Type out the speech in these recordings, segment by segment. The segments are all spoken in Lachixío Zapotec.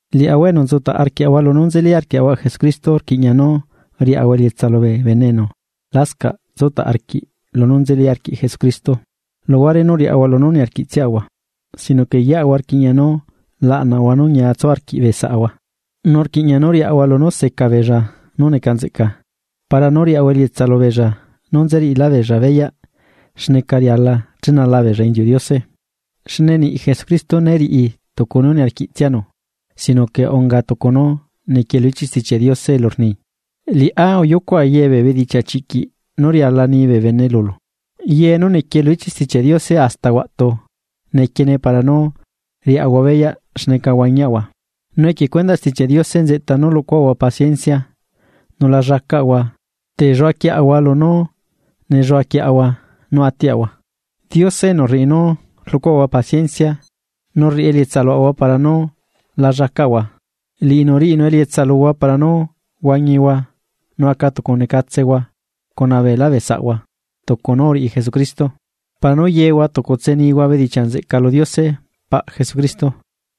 Liaꞌahua enu nzutaꞌ arquiaꞌahua lunú nzeli arquiaꞌahua Jesucristo rquiꞌña nú riaꞌahua elietsa lubee bene enu lascaꞌ tsutaꞌ arquiꞌ lunú nzeli arquiꞌ Jesucristo luhuare nú riaꞌahua lunú niarquiꞌtsiaꞌahua. Sino que yeꞌahua rquiꞌña nú laꞌnaꞌahua nú ñia tsu arquiꞌ bee saꞌahua. Nu rquiꞌña nú riaꞌahua lunú seca beella nú neca nzeꞌca, para nú riaꞌahua elietsa lubeella nú nzeriꞌilábeella beyaꞌ xneca riala chenala beella inziuꞌ Diose. Xne niꞌ Jesucristo né riꞌi tucu nú niarquiꞌtsianu sino que unga tucu nú nequie lu ichiꞌ Stichiaꞌ Diose elu rni: “Liꞌá uyucuꞌa ye bee bedichiaꞌ chiꞌquiꞌ nú riala ni bee bene lulu.” Ye nú nequie lu ichiꞌ Stichiaꞌ Diose hasta huaꞌtu nequiene para nú riaꞌahua beyaꞌ xneca huañiaꞌahua, nu equie cuendaꞌ Stichiaꞌ Diose nzeꞌta nú rluꞌcuaꞌahua paciencia, nu la llacaꞌahua telluaquieꞌahua lunú nelluaquieꞌahua nú atiaꞌahua. Diose enu rriꞌi nú rluꞌcuaꞌahua paciencia, nu rriꞌi elietsa luaꞌahua para nú la llacaꞌahua, liꞌinu riꞌinu elietsa luhua para nú huañihua nu aca tucunecatsehua cuna beelá bee saꞌahua tucu nú uriꞌi Jesucristo. Para nú yehua tucutse nihua bedichiaꞌ nzeꞌca lu Diose, paꞌ Jesucristo.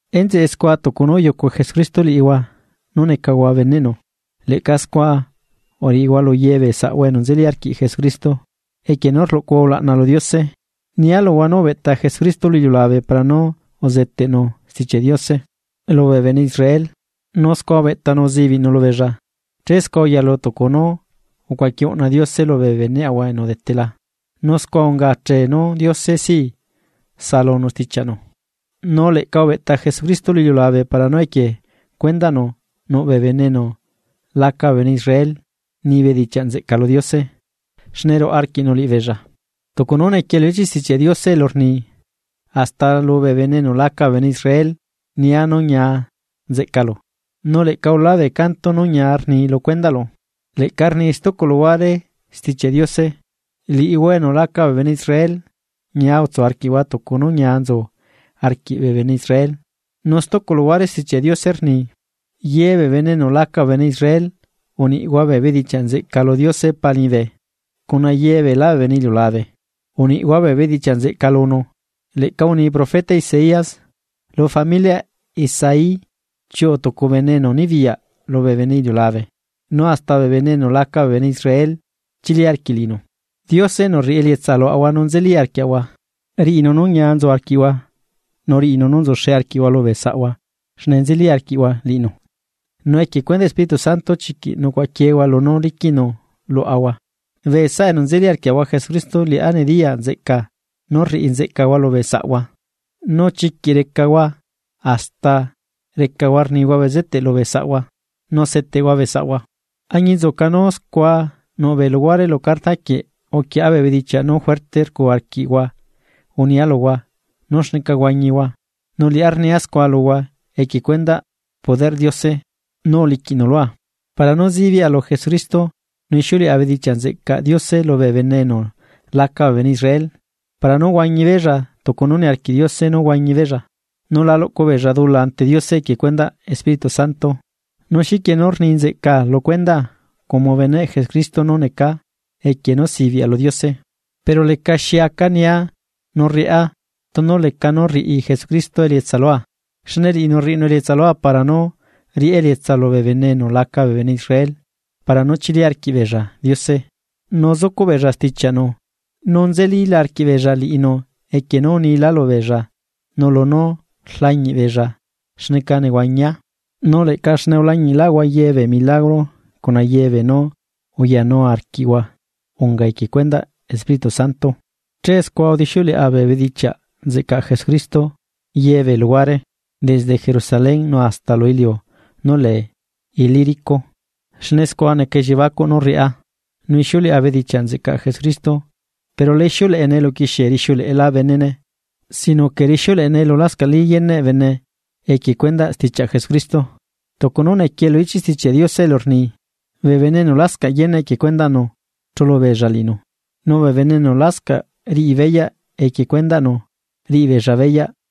Enzeꞌe scua tucu nú uyucu Jesucristo liꞌihua nú necahua bee beneꞌnu, leꞌca scua uriꞌihua lu ye bee saꞌhua enu nzeli arquiꞌ Jesucristo, equie nú rluꞌcuhua ulaꞌna lu Diose. Nia luhua nú ubeꞌta Jesucristo lu iliulabe para nú uzeteꞌnu Stichiaꞌ Diose lubee bene Israel nu scua ubeꞌtanu uzibiꞌnu lubeella che scua uyalu tucu nú ucuaqui uꞌna Diose lubee beneꞌahua enu udetela nu scua unga achee nú Diose sí saꞌalunu stichiaꞌnu. Nu leꞌca ubeꞌta Jesucristo lu iliulabe para nú equie cuendaꞌnu nuꞌbee bene enu laca bee bene Israel nibeella bedichiaꞌ nzeꞌca lu Diose xne ruaꞌa arquiꞌnu liꞌibeella, tucu nú nequie lu ichiꞌ Stichiaꞌ Diose elu rni: Hasta lubee bene enu laca bee bene Israel nia nú ñia nzeꞌcalu, nu leꞌca ulaa bee canto nu ñia ni lu cuendaꞌlu. Leꞌca rni stucu luhuare Stichiaꞌ Diose: Liꞌihua enu laca bee bene Israel, ñia utsu arquiꞌhua tucu nú ñia nzu arquiꞌ bee bene Israel. Nu stucu luhuare Stichiaꞌ Diose rni: Ye bee bene enu laca bee bene Israel uniꞌhua bee bedichiaꞌ nzeꞌca lu Diose Pa liñibe. Cuna yebeelá bee bene iliulabe, uniꞌhua bee bedichiaꞌ nzeꞌca lunu. Leꞌca uni profeta Isaías: Lu familiaꞌ Isaí chiuꞌu tucu bene enu nibiyaꞌ lubee bene iliulabe, nu hasta bee bene enu laca bee bene Israel chili arquiꞌ liꞌinu. Diose enu rriꞌi elietsa luaꞌahua nú nzeli arquiaꞌahua, riꞌinu nú ñia nzu arquiꞌhua nu riꞌinu nú nzuxe arquiꞌhua lubee saꞌhua xne nzeli arquiꞌhua liꞌinu, nu equie cuendaꞌ Espíritu Santo chiquiꞌ nucuaꞌaquiehua lunú liquiꞌnu luaꞌahua. Bee saꞌa enu nzeli arquiaꞌahua Jesucristo liꞌá nediyaa nzeꞌcaa nú rriꞌi nzeꞌcahua lubee saꞌhua, nu chiquiꞌ recahua hasta rnihua bezeteꞌ lubee saꞌhua nu seteꞌhua bee saꞌhua. Añinzuca nú scua nuꞌbee luhuare lu carta quieꞌ uquieꞌa bee bedichiaꞌ nú juerte rcu arquiꞌhua unia luhua nú xneca huañihua nu liꞌá rnia scua luhua equie cuendaꞌ poderꞌ Diose nú uliquiꞌnu lua. Para nú zibiꞌa lu Jesucristo nu ixiuleꞌa bedichiaꞌ nzeꞌcaꞌ Diose lubee bene enu laca bee bene Israel para nú huañibeella tucu nú niarquiꞌ Diose nú huañi beella, nu la luꞌcu beella dula ante Diose equie cuendaꞌ Espíritu Santo. Nu xiquie nú rni nzeꞌcaa lu cuendaa como beneꞌ Jesucristo nú necaa equie nú sibiꞌa lu Diose, pero lecaxi aca nia nu rriꞌá tunu leca nú rriꞌi Jesucristo elietsa lua, xne liꞌinu rriꞌinu elietsa lua para nú riꞌá elietsa lubee bene enu laca bee bene Israel para nú chili arquiꞌbeella Diose nu zucuꞌ beella stichiaꞌnu, nú nzelila arquiꞌbeella, equie nú unila lubeella nu lunú rlañiꞌ beella xneca nehuañia. Nu leꞌca xne ulañiꞌlaꞌhua ye bee milagro cuna ye beenú uyanu arquiꞌhua unga equie cuendaꞌ Espíritu Santo. Che scua udixiuleꞌa bee bedichiaꞌ nzeꞌcaꞌ Jesucristo yebee luhuare, desde Jerusalén nu hasta lu iliu nú lee Ilírico. Xne scua neca elliebacuꞌ nú rriꞌá, nú ixiuleꞌa bedichiaꞌ nzeꞌcaꞌ Jesucristo. Pero la ixiuleꞌene elu uquixie rixiuleꞌela benene sino que rixiuleꞌene elu lascaꞌlí yeneꞌ bene equie cuendaꞌ stichiaꞌ Jesucristo. Tucu nú nequie lu ichiꞌ Stichiaꞌ Diose elu rni: Bee bene enu lascaꞌ yeneꞌ equie cuendaꞌnu chulu beella liꞌinu, nu bee bene enu lascaꞌ riꞌi beyaꞌ equie cuendaꞌnu riꞌi beella beyaꞌ.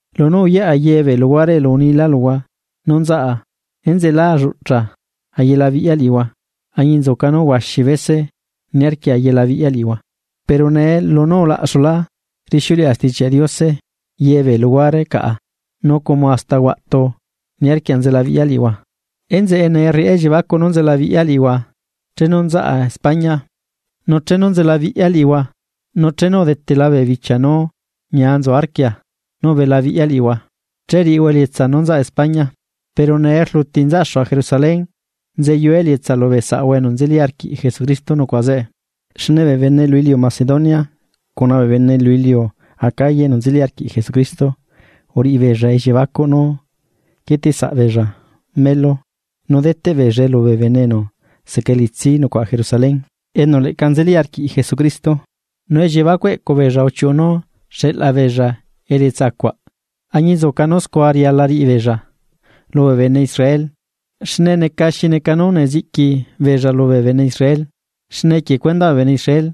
Lunu uyaꞌa ye bee luhuare elu unila luhua nú nzaꞌa enzeꞌe lá lluchaꞌa ayelabiꞌya liꞌihua añinzuca nú huaxi bese uniarquia ayelabiꞌya liꞌihua. Pero nee lunú ulaꞌxulá rixiuleꞌa Stichiaꞌ Diose ye bee luhuare caꞌa nu como hasta huaꞌtu niarquia nzelabiꞌya liꞌihua, enzeꞌe nee rriꞌá elliebacuꞌ nú nzelabiꞌya liꞌihua chenu nzaꞌa España. Nu chenu nzelabiꞌya liꞌihua, nu chenu udetela bee bichia nú ñia nzu arquia nú ubelabiꞌya liꞌihua, che riꞌihua elietsaa nú nzaꞌa España. Pero nee rluti nzaꞌxua Jerusalén nzeyua elietsa lubee saꞌahua enu nzeli arquiꞌ Jesucristo nucuaꞌa zeꞌe. Xne bee bene lu iliu Macedonia cuna bee bene lu iliu Acaya enu nzeli arquiꞌ Jesucristo uriꞌi beella elliebacuꞌ nú quieteꞌ saꞌbeella melu nú deteꞌ beella lubee bene enu seca elitsi nucuaꞌa Jerusalén, enu leꞌca nzeli arquiꞌ Jesucristo. Nu elliebacuꞌ eꞌcubeella uchiuꞌu nú xeꞌla beella elietsa cuaꞌ, añinzuca nú scua riala riꞌibeella lubee bene Israel xne neca xi neca nú neziꞌqui beella lubee bene Israel xne equie cuendaꞌ bee bene Israel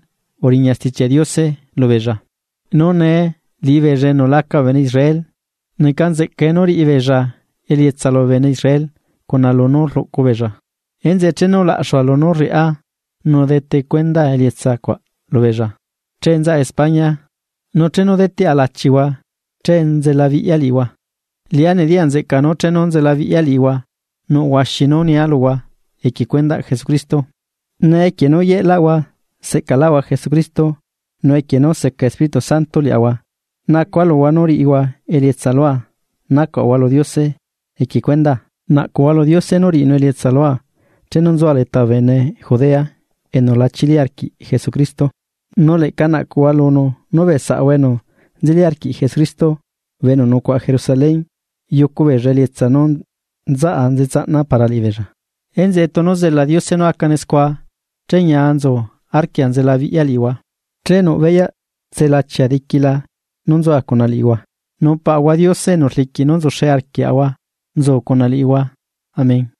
uriña Stichiaꞌ Diose lubeella, nu nee liꞌibeella enu laca bee bene Israel, neca nzeꞌcae nú riꞌi beella elietsa lubee bene Israel cuna lunú rluꞌcu beella. Enzeꞌe chenu laꞌxua lunú rriꞌá nu detecuendaa elietsa cuaꞌ lubeella, che nzaꞌa España nu chenu deteꞌa lachihua che nzelabiꞌya liꞌihua. Liꞌá nediya nzeꞌca nu chenu nzelabiꞌya liꞌihua nuꞌ huaxi nú nia luhua equie cuendaꞌ Jesucristo. Nee equie nú yeꞌlaꞌahua seꞌcalaꞌahua Jesucristo, nu equie nú seca Espíritu Santo liaꞌahua nacua luhua nú riꞌihua elietsa lua nacuaꞌahua lu Diose equie cuendaa. Naꞌcuhua lu Diose nú riꞌinu elietsa lua chenu nzua leta bee bene Judea enu lá chili arquiꞌ Jesucristo, nu leꞌca naꞌcuhua lunu nú bee saꞌahua enu nzeli arquiꞌ Jesucristo bee enu nucuaꞌa Jerusalén, yucu beella elietsa nú nzaꞌa nzetsaꞌna para liꞌibeella. Enzeꞌe tunu zela Diose nú acane scua che ñia nzu arquia nzelabiꞌya liꞌihua, che nuꞌ beyaꞌ tselachia diquila nú nzua cuna liꞌihua. Nu Paꞌahua Diose enu rliquiꞌ nú nzuxe arquiaꞌahua nzu cuna liꞌihua. Amén.